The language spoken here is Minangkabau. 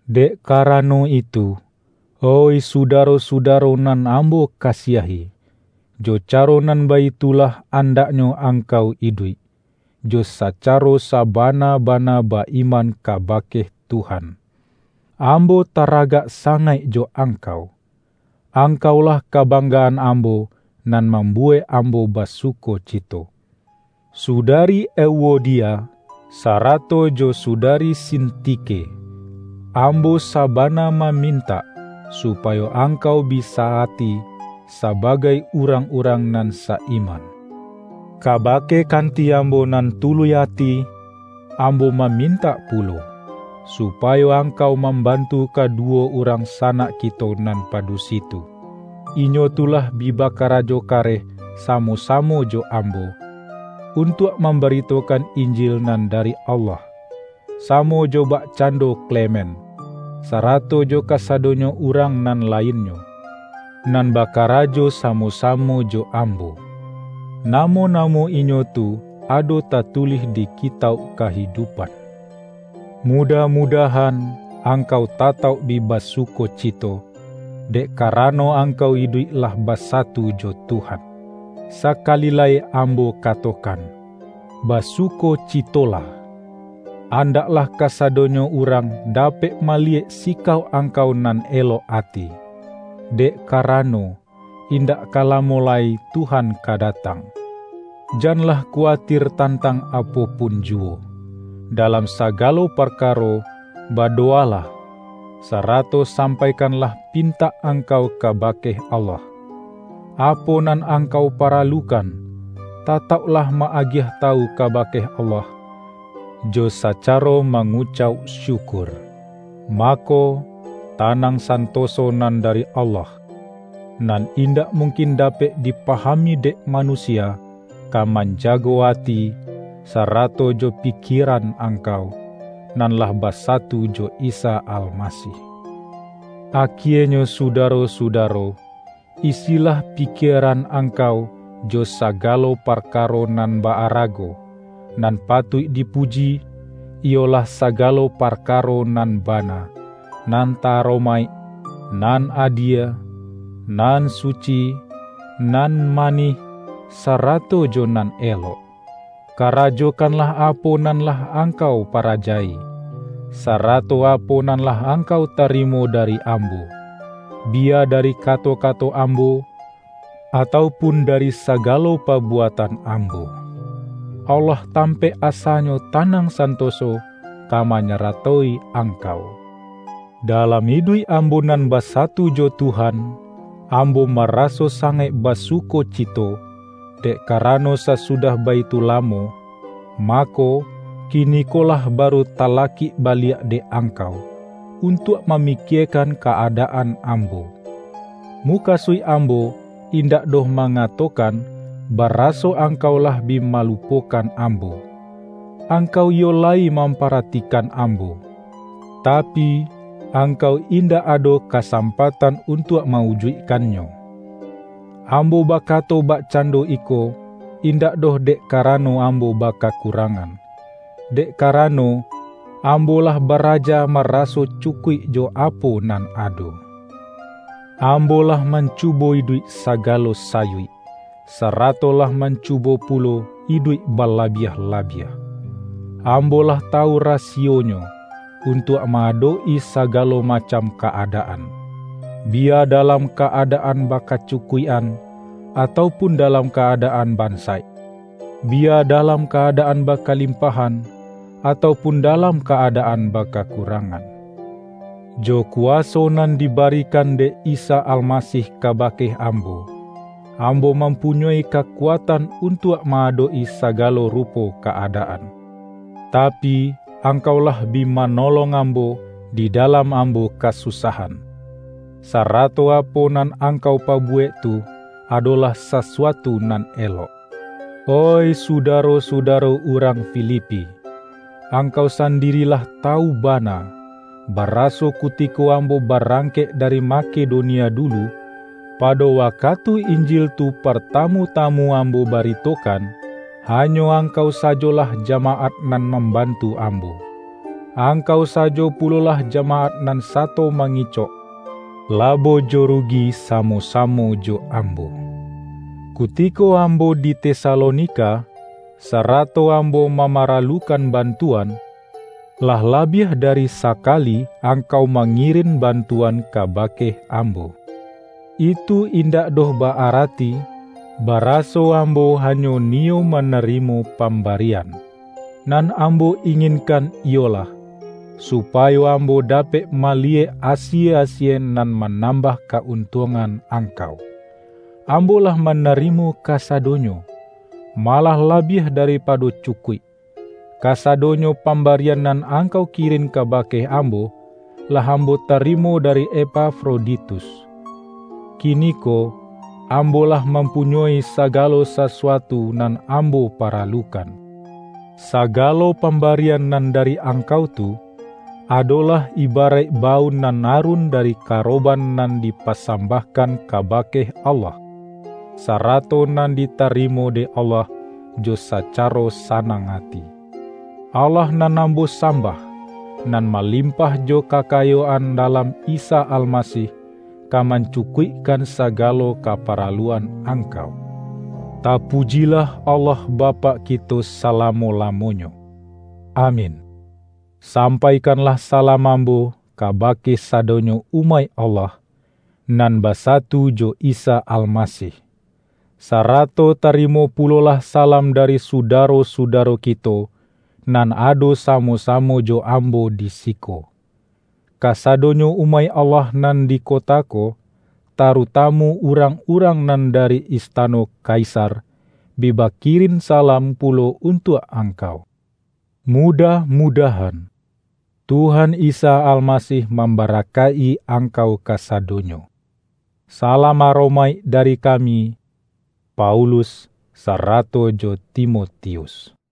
Dek karano itu, oih sudaro-suda-ro nan ambo kasiahi, jo caro nan baitulah andaknyo angkau iduik, jo sacaro sabana-bana ba-iman kabake Tuhan. Ambo taragak sangaik jo ang-kau! Angkaulah kabanggaan ambo nan mambuwek ambo basukocito. Sudari Euodia, sarato jo sudari Sintike! Ambo sabana mamintak, su-payo angkau bi sa-ati sabagai urang-urang nan sa-iman. Kabake kanti ambo nan tuluih ati, ambo mamintak pulo, supayo angkau mambantu kadu-wo urang sanak kito nan padusi tu. Inyo tu lah bi bakarajo kareh samo-samo jo ambo, untuak mambaritokan Injil nan dari Allah; samo jo bakcan-do Klemen, sarato jo kasadonyo urang nan lainnyo, nan bakarajo samo-samo jo ambo. Namo-namo inyo tu ado ta-tulih di Kitauk Kahidupan. Mudah-mudahan, angkau tatauk bi basukocito, dek karano angkau iduik lah basatu jo Tuhan. Sakali lai ambo katokan: basukocitolah! Andaklah kasadonyo urang da-pek maliyek sikauk angkau nan elok ati. Dek karano, indak ka lamo lai Tuhan ka datang. Janlah kuwatir tantang apo pun juwo. Dalam sagalo parkaro, badowalah, sarato sampai-kanlah pintak angkau kabake Allah. Apo nan angkau paralukan, tatauk-lah ma-agiah tawu kabake Allah, jo sacaro mangucauk syukur. Mako, tanang santoso nan dari Allah, nan indak mungkin dapek dipahami dek manusia, ka manjago ati, sarato jo pi-kieran angkau, nan lah basatu jo Isa Almasih. Akienyo sudaro-sudaro, isilah pikieran angkau jo sagalo parka-ro nan ba-arago, nan patuik dipuji, iyolah sagalo parkaro nan bana, nan ta-aromaik, nan adie, nan suci, nan manih, sarato jo nan elok. Karajo-kanlah apo nan lah angkau paraja-i, sarato apo nan lah angkau tarimo da-ri ambo; biya dari kato-kato ambo, atau pun dari sagalo pabuatan ambo. Allah tampaik asanyo tanang santo-so, ka manyaratoi angkau. Dalam iduik ambo nan basatu jo Tuhan, ambo maraso sangaik basukoci-to, dek karano sasudah baitu lamo, ma-ko, kinikolah baru talakik baliak dek angkau, untuak mamikiekan ka-adaan ambo. Mukasuik ambo indak doh ma-ngatokan, baraso angkau lah bi malu-pokan ambo; angkau iyo layi mampa-ratikan ambo, tapi, angkau indak ado kasampatan untuak ma-ujuikkannyo. Ambo bakato bakcando iko, indak doh dek karano ambo bakakurangan, dek karano, ambo lah baraja maraso cu-kuik jo apo nan ado. Ambo lah man-cubo iduik sagalo sayuik, sarato lah mancubo pulo iduik balabiah-labiah. Ambo lah tawu rasiyonyo, untuak ma-adok-i sagalo macam ka-adaan; biya da-lam ka-adaan bakacukuik-an, atau pun dalam ka-adaan bansaik, biya dalam ka-adaan bakalimpahan, atau pun dalam ka-adaan bakakurangan. Jo kuwaso nan dibarikan dek Isa Almasih kabake ambo, ambo mampunyoi kakuatan un-tuak ma-adok-i sagalo rupo ka-adaan. Tapi, angkau lah bi manolong am-bo di dalam ambo kasusahan; sarato apo nan angkau pabuwek tu, adolah sasuatu nan elok. Oih sudaro-suda-ro urang Filipi! Angkau sandiri lah ta-wu bana, baraso kutiko ambo barang-kek dari Makedonia dulu, pado wakatu Injil tu partamu-tamu ambo barito-kan, hanyo angkau sajolah jamaat nan mambantu ambo; angkau sajo pulolah jamaat nan sato mangicok, labo jo ru-gi samo-samo jo ambo. Kutiko ambo di Tesalonika, sarato ambo mamara-lukan bantuan, lah labiah dari sakali angkau mangirin bantuan kabake am-bo. Itu indak doh ba-arati, baraso ambo hanyo niyo manarimo pamba-rian. Nan ambo inginkan iyolah, su-payo ambo dapek maliyek asie-asie nan manambah ka-untuangan angkau. Ambo lah manarimo kasadonyo — malah labiah daripado cukuik! Kasa-donyo pambarian nan angkau kirin kabake ambo, lah ambo tarimo dari Epafroditus. Kiniko ambo lah mam-punyoi sagalo sasuatu nan ambo pa-ralukan. Sagalo pambarian nan dari angkau tu, adolah ibaraik baun nan arun dari karoban nan dipasambah-kan kabake Allah, sarato nan ditari-mo dek Allah jo sacaro sanang ati. Allah nan ambo sambah, nan malim-pah jo kakayoan dalam Isa Almasih, ka mancukuikkan sagalo kaparaluan angkau. Tapujilah Allah Bapak ki-to salamo-lamonyo! Amin! Sampaikanlah salam ambo kaba-ke sadonyo umaik Allah, nan basa-tu jo Isa Almasih. Sarato tarimo pu-lolah salam dari sudaro-sudaro kito, nan ado samo-samo jo ambo di siko. Kasadonyo umaik Allah nan di ko-ta ko, tarutamu urang-urang nan da-ri istano Kaisar, bi bakirin salam pu-lo untuak angkau. Mudah-mudahan, Tuhan Isa Alma-sih mambarakaik-i angkau kasadonyo. Salam aromaik dari kami, Paulus sarato jo Timotius